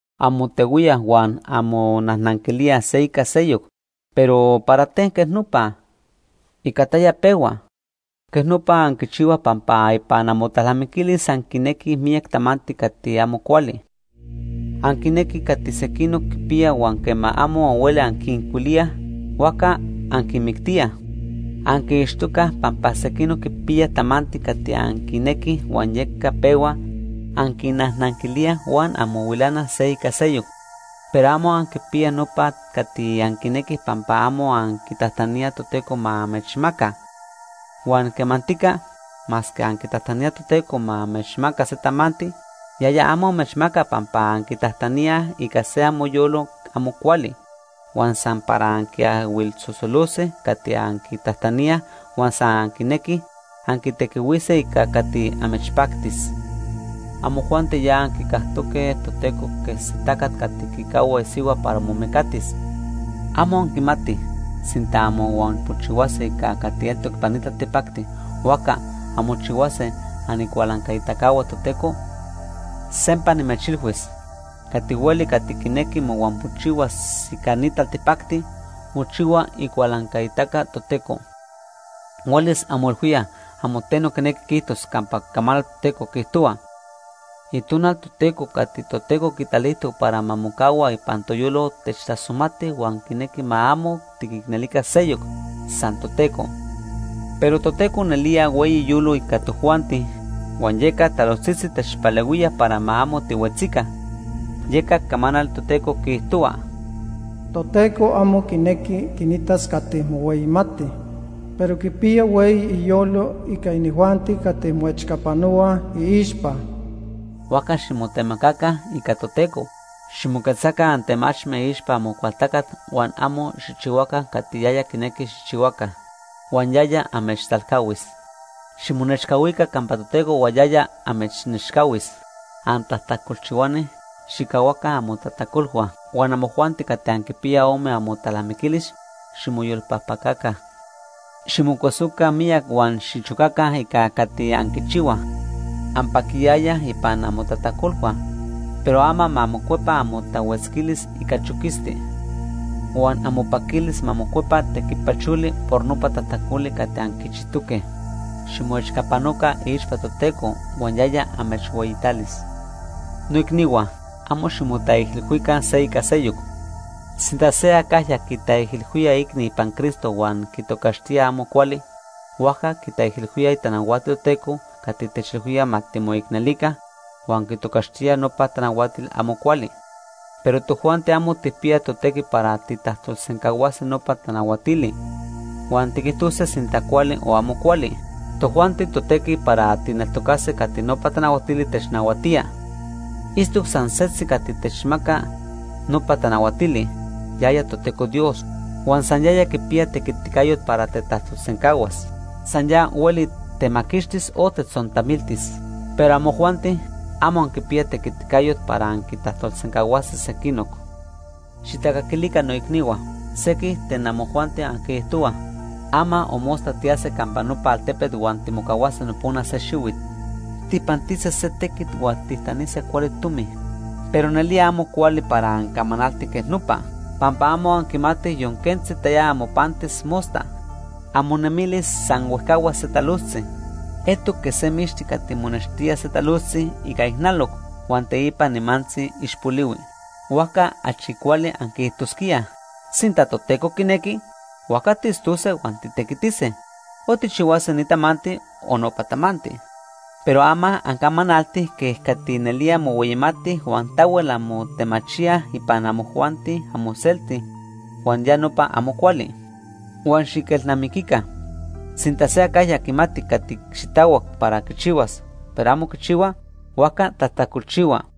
Anmotehuíaj huan anmonajnanquilíaj se ica seyoc, pero ¿para ten quej nopa? ¿Ica taya pehua? Quej nopa anquichihuaj pampa ipan amotalnamiquilis anquinequij miyac tamanti cati amo cuali. Anquinequij cati sequinoc quipiyaj huan quema amo anhuelij anquincuilíaj, huajca anquinmictíaj. Anquiixtocaj pampa sequinoc quipiyaj tamanti cati anquinequij huan yeca pehua anquinnajnanquilíaj huan anmohuilanaj se ica seyoc. Pero amo anquipiyaj nopa cati anquinequij pampa amo anquitajtaníaj Toteco ma amechmaca. Huan quemantica, masque anquitajtaníaj Toteco ma amechmaca se tamanti, yaya amo amechmaca pampa anquitajtaníaj ica se amoyolo amo cuali, huan san para anquiahuilsosolose cati anquitajtaníaj huan san anquinequij anquitequihuise ica cati amechpactis. Amojuanti ya anquicajtoque Toteco quej se tacat cati quicahua isihua para momecatis. ¿Amo anquimatij, sinta anmohuampojchihuase ica cati eltoc ipan ni taltipacti, huajca anmochihuase anicualancaitacahua Toteco? Sempa nimechilhuis, cati hueli cati quinequi mohuampojchihuas ica ni taltipacti, mochihua icualancaitaca Toteco. ¿Huelis anmoilhuíaj amo teno quinequi quiijtos campa Icamanal Toteco quiijtohua: “Itonal Toteco cati Toteco quitalijtoc para ma mocahua ipan toyolo techtasomati huan quinequi ma amo tiquicnelica seyoc, san Toteco”? Pero Toteco nelía hueyi iyolo ica tojuanti, huan yeca talojtzitzi techpalehuía para ma amo tihuetzica. Yeca Icamanal Toteco quiijtohua: “Toteco amo quinequi quinitas cati mohueyimatij, pero quipiya hueyi iyolo ica inijuanti cati moechcapanohuaj iixpa.” Huajca ximotemacaca ica Toteco. Ximoquetzaca antemachme iixpa Amocualtacat huan amo xijchihuaca cati yaya quinequi xijchihuaca, huan yaya amechtalcahuis. Ximonechcahuica campa Toteco huan yaya amechnechcahuis. Antajtacolchihuani, xijcahuaca amotajtacolhua. Huan amojuanti cati anquipiyaj ome amotalnamiquilis, ximoyolpajpacaca. Ximocuesoca miyac huan xichocaca ica cati anquichihuaj. Anpaquiyayaj ipan amotajtacolhua, pero ama ma mocuepa amotahuetzquilis ica choquisti. Huan amopaquilis ma mocuepa tequipacholi por nopa tajtacoli cati anquichijtoque. Ximoechcapanoca iixpa Toteco huan yaya amechhueyitalis. Noicnihua, amo ximotaijilhuica se ica seyoc. Sinta se acajya quitaijilhuía iicni ipan Cristo huan quitocaxtía amo cuali, huajca quitaijilhuía itanahuatil Toteco cati techilhuía ma timoicnelica, huan quitocaxtía nopa tanahuatili amo cuali. Pero tojuanti amo tijpiyaj totequi para tijtajtolsencahuase nopa tanahuatili, huan tiquijtose sinta cuali o amo cuali. Tojuanti totequi para tijneltocase cati nopa tanahuatili technahuatía. Itztoc san setzi cati techmaca nopa tanahuatili, yaya Toteco Dios, huan san yaya quipiya tequiticayot para tetajtolsencahuas. San ya hueli temaquixtis o tetzontamiltis. Pero amojuanti, amo anquipiyaj tequiticayot para anquintajtolsencahuase sequinoc. Xijtacaquilica noicnihua. Sequij ten amojuanti anquiijtohuaj: “Ama o mosta tiyase campa nopa altepet huan timocahuase nopona se xihuit. Tijpantise se tequit huan tijtanise cuali tomi.” Pero nelía amo cuali para ancamanaltij quej nopa. Pampa amo anquimatij yon quentzi taya amopantis mosta. Amonemilis san huejcahuas se talojtzi. Eltoc quej se mixti cati monextía se talojtzi ica ijnaloc huan teipa nimantzi ixpolihui. Huajca achi cuali anquiijtosquíaj: “Sinta Toteco quinequi, huajca tiitztose huan titequitise, o tijchihuase ni tamanti o nopa tamanti.” Pero ama, ancamanaltij quej cati nelía mohueyimatij huan tahuel anmotemachíaj ipan amojuanti amoselti, huan ya nopa amo cuali. Huan xiquelnamiquica, sinta se acajya quimati cati xitahuac para quichihuas, pero amo quichihua, huajca tajtacolchihua.